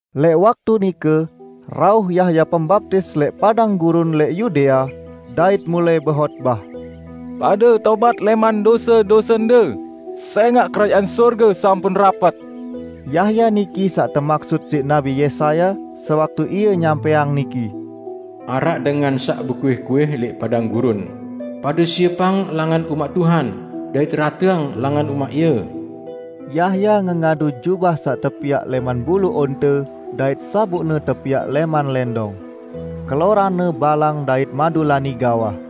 Lẽq waktu nike rauh Yahya Pembaptis lẽq padang gurun lẽq Yudea dait mulai behotbah. "Pade tobat lẽman dose-dosende, sẽngaq Kerajaan Sorge sampun rapet!" Yahya niki saq temaksut siq Nabi Yesaya sewaktu ie nyampẽang niki, "Araq dengan saq bekuih-kuih lẽq padang gurun, 'Pade siepang langan umaq Tuhan; dait rateang langan umaq Ie.' " Yahya ngengadu jubah saq tepiaq lẽman bulu onte dait sabukne tepiaq lẽman lẽndong. Keloranne balang dait madulani gawah.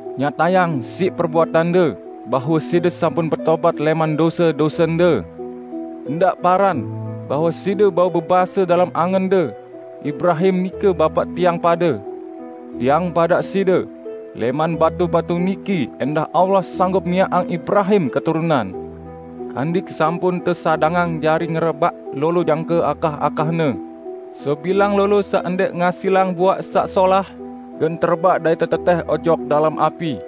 Nyatayang siq perbuatande bahwe side sampun betobat lẽman dose-dosende. Ndaq paran, bahwe side bau bebase dalem angende: Ibrahim nike bapaq tiang pade! Tiang badaq side: Lẽman batu-batu niki ẽndah Allah sanggup miaqang Ibrahim keturunan! Kandik sampun tesadangang jari ngerebaq lolo jangke akah-akahne. Sebilang lolo saq ndẽq ngasilang buaq saq solah, gen terebaq dait tetetẽh ojok dalem api.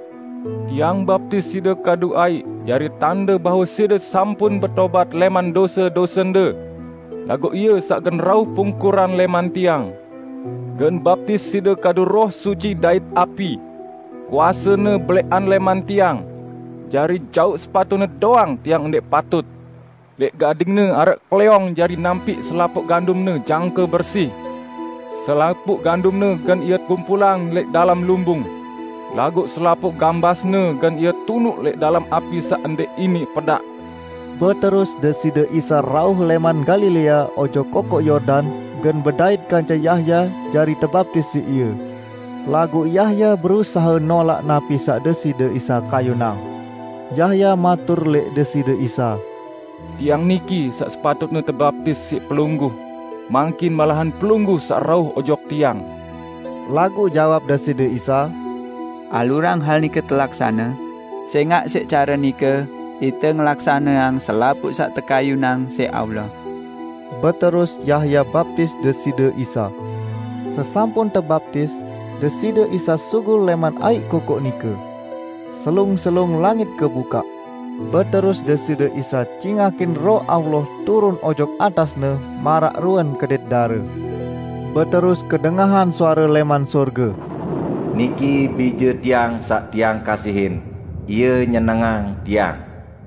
Tiang baptis side kadu aiq jari tande bahwe side sampun betobat lẽman dose-dosende. Laguq Ie saq gen rauh pungkuran lẽman tiang, gen baptis side kadu Roh Suci dait api. Kuase-Ne belẽqan lẽman tiang. Jari jauq sepatu-Ne doang tiang ndẽq patut. Lẽq gading-Ne araq klẽong jari nampiq selapuq gandum-Ne jangke bersi; selapuq gandumne gen Ie kumpulang lẽq dalem lumbung, laguq selapuq gambasne gen Ie tunuq lẽq dalem api saq ndẽq iniq pedaq." Beterus Deside Isa rauh lẽman Galilea ojok Kokoq Yordan gen bedait kance Yahya jari tebaptis siq ie. Laguq Yahya berusahe nolaq napi saq Deside Isa kayunang. Yahya matur lẽq Deside Isa, "Tiang niki saq sepatutne tebaptis siq Pelungguh, mangkin malahan Pelungguh saq rauh ojok tiang." Laguq jawab Deside Isa, "Alurang hal nike telaksane, sẽngaq siq care nike ite ngelaksaneang selapuq saq tekayunang siq Allah." Beterus Yahya baptis Deside Isa. Sesampun tebaptis, Deside Isa sugul lẽman aiq kokoq nike. Selung-selung langit kebukaq, beterus Deside Isa cingakin Roh Allah turun ojok atas-Ne maraq ruen kedit dare. Beterus kedengahan suare lẽman sorge, "Niki Bije Tiang saq Tiang kasihin, Ie nyenengang Tiang."